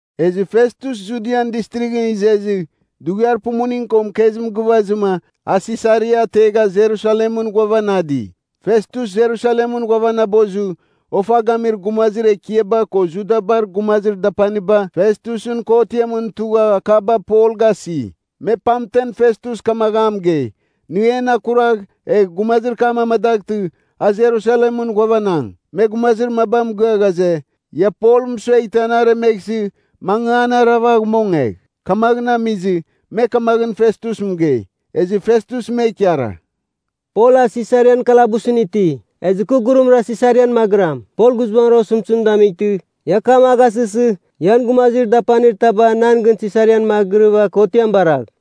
Ezɨ Festus Judian Distrighɨn izezɨ, dughiar pumuning ko mɨkezim gɨvazɨma a Sisaria ategha Jerusalemɨn ghuavanadi. Festus Jerusalemɨn ghuavanabozɨ, ofa gamir gumazir ekiaba ko Judabar gumazir dapaniba Festusɨn kotiamɨn tugha akaba Pol gasi. Me pamten Festus kamagh a mɨgei, nɨ en akuragh egh gumazir kam amadaghtɨ, a Jerusalemɨn ghuavanang. Me gumazir maba mɨgɨa ghaze, ia Pol mɨsueghtɨ an aremeghsɨ, mangɨ an aravagh mongegh. Kamaghɨn amizɨ, me kamaghɨn Festus mɨgei. Ezɨ Festus me ikara, “Pol a Sisarian kalabusɨn iti. Ezɨ kɨ gurumra Sisarian magɨram. Pol guizbangɨn osɨmtɨzim damightɨ, ia akam a gasɨsɨ, ian gumazir dapanir taba nan gɨn Sisarian magɨrɨva kotiam baragh.”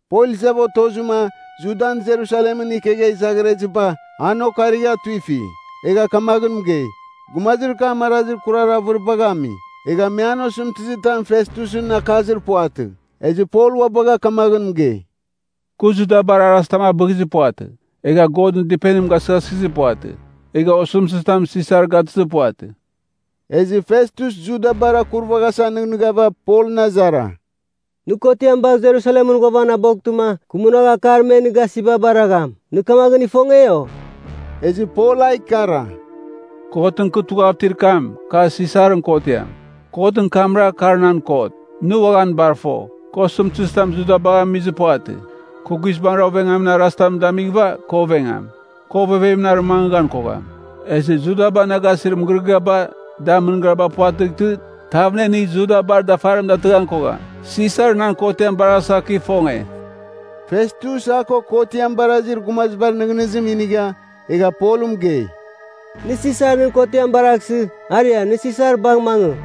Pol izava otozɨma Judan Jerusalemɨn ikegha izaghireziba an okarigha tuifi. Egha kamaghɨn mɨgei, gumazir kam arazir kurar avɨribagh ami. Egha me an osɨmtɨzitam Festusɨn akazir puvatɨ. Ezɨ Pol ua bagha kamaghɨn mɨgei, “Kɨ Judabar arazitam abɨghizir puvatɨ. Egha Godɨn Dɨpenim gasɨghasɨghizir puvatɨ, egha osɨmtɨzitam Sisar gatɨzir puvatɨ.” Ezɨ Festus Judabar akurvaghasa nɨghnɨghava Polɨn azara, “Nɨ kotiam bagh Jerusalemɨn ghuavanaboghtɨma, kɨ munagh akar me nɨ gasiba baragham? Nɨ kamaghɨn ifonge, o?” Ezɨ Pol a ikara, “Kotɨn kɨ tughav itir kam, kar Sisarɨn kotiam. Kotɨn kamra, kar nan kot. Nɨ uaghan bar fo, kɨ osɨmtɨzitamɨn Judabagh amizir puvatɨ. Kɨ guizbangɨra ovengamin arazitam damighɨva kɨ ovengam. Kɨ ovevemɨn arɨmangɨghan kogham. Ezɨ Judaba na gasir mɨgɨrɨgɨaba, da mɨngariba puvatɨghtɨ, tav na inigh Judabar dafarim datɨghan kogham. Sisar nan kotiam baraghasa kɨ ifonge!” Festus a ko kotiam barazir gumazibar nɨghnɨzim inigha, egha Polɨn mɨgei, “Nɨ Sisar nɨn kotiam baraghsɨ, aria nɨ Sisar bagh mangɨ!”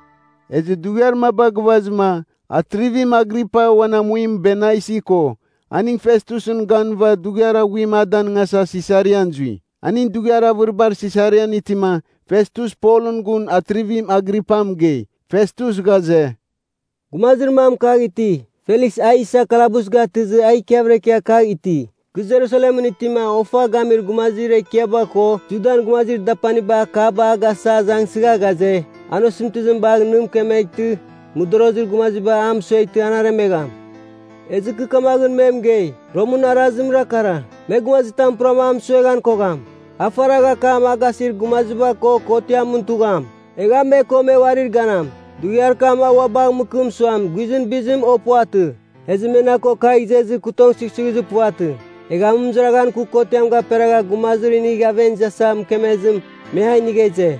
Ezɨ dughiar maba gɨvazɨma, Atrivim Agripa uan amuim Bernaisi ko aning Festusɨn ganɨva dughiar aghuim a danɨngasa Sisarian zui. Aning dughiar avɨribar Sisarian itima Festus Polɨn gun Atrivim Agripa mɨgei. Festus ghaze, “Gumazir mam kagh iti. Feliks a isa kalabus gatɨzɨ a ikiavɨra ikia kagh iti. Kɨ Jerusalemɨn itima ofa gamir gumazir ekiaba ko Judan gumazir dapaniba akaba a gasa azangsɨgha ghaze, an osɨmtɨzim bagh nɨ mɨkemeghtɨ, mɨdorozir gumaziba a mɨsueghtɨ an aremegham. “Ezɨ kɨ kamaghɨn me mɨgei, ‘Romɨn arazimra kara, me gumazitam puram a mɨsueghan kogham. A faragh akam a gasir gumaziba ko kotiamɨn tugham. Egh a me ko me uarir ganam. Dughiar kam a ua bagh mɨkɨm suam guizɨn bizim o puvatɨ.’ “Ezɨ me na ko kagh izezɨ, kɨ tong sughsughizir puvatɨ. Egha amɨmɨzaraghan kɨ kotiam gaperagha gumazim inigh aven izasa mɨkemezɨ, me a inigha ize.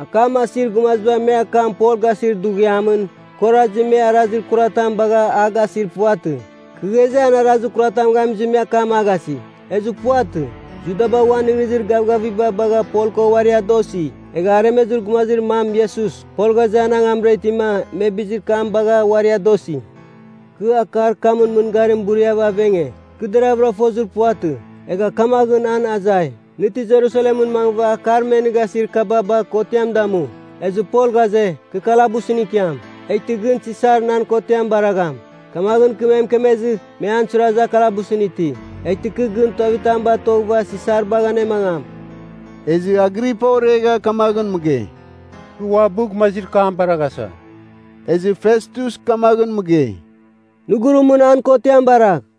Akam asir gumaziba me akam Pol gasir dughiamɨn, kɨ orazi me arazir kuratam baghava a gasir puvatɨ. Kɨ ghaze, an arazir kuratam gamizɨ, me akam a gasi. Ezɨ puvatɨ. Judaba uan nɨghnɨzir gavgaviba bagha Pol ko uari adosi. Egha aremezir gumazir mam Iesus, Pol ghaze, an angamra itima me bizir kam bagha uari adosi. Kɨ akar kamɨn mɨngarim buriava avenge. Kɨ deragha fozir puvatɨ. Egha kamaghɨn an azai, ‘Nɨ ti Jerusalemɨn mangɨva akar me nɨ gasir kaba bagh kotiam damu?’ Ezɨ Pol ghaze, ‘Kɨ kalabusɨn ikiam, eghtɨ gɨn Sisar nan kotiam baragham.’ Kamaghɨn kɨ me mɨkemezɨ, me an suirazɨ a kalabusɨn iti. Eghtɨ kɨ gɨn tuavitam batoghɨva Sisar bagh anemangam.” Ezɨ Agripa oregha kamaghɨn mɨgei, “Kɨ uabɨ gumazir kam baraghasa.” Ezɨ Festus kamaghɨn mɨgei, “Nɨ gurumɨn an kotiam baragh.”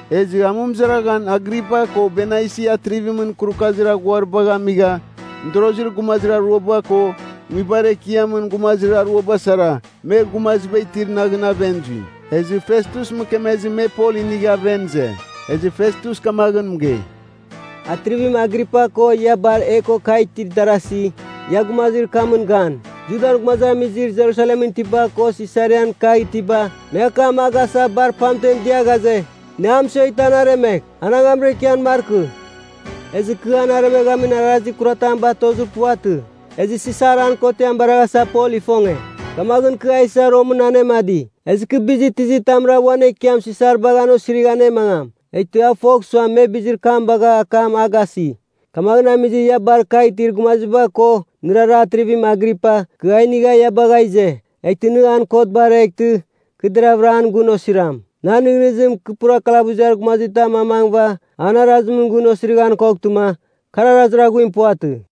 Ezɨ amɨmɨzaraghan Agripa ko Bernaisi atrivimɨn kurukazir aghuaribagh amigha, mɨdorozir gumazir aruaba ko nguibar ekiamɨn gumazir aruaba sara me gumaziba itir naghɨn aven zui. Ezɨ Festus mɨkemezɨ me Pol inigha aven ize. Ezɨ Festus kamaghɨn mɨgei, “Atrivim Agripa ko ia bar e ko kagh itir darasi, ia gumazir kamɨn gan! Judan gumazamizir Jerusalemɨn itiba ko Sisarian kagh itiba, me akam a gasa bar pamtem dia ghaze, ‘Nɨ a mɨsueghtɨ an aremegh, an angamra ikian markɨ!’ Ezɨ kɨ an aremeghamin arazir kuratam batozir puvatɨ. Ezɨ Sisar an kotiam baraghasa Pol ifonge. Kamaghɨn kɨ a isa Romɨn anemadi. Ezɨ kɨ bizir tizitamra uan ekiam Sisar bagh an osirigh anemangam? Eghtɨ a fogh suam, me bizir kam bagha akam a gasi. Kamaghɨn amizɨ ia bar kagh itir gumaziba ko, nɨrara Atrivim Agripa, kɨ a inigha ia bagha ize. Eghtɨ nɨ an kot bareghtɨ, kɨ deravɨra an gun osiram. “Nan nɨghnɨzim, kɨ pura kalabuziar gumazitam amangɨva, an arazimɨn gun osirighan koghtɨma, kar arazir aghuim puvatɨ.”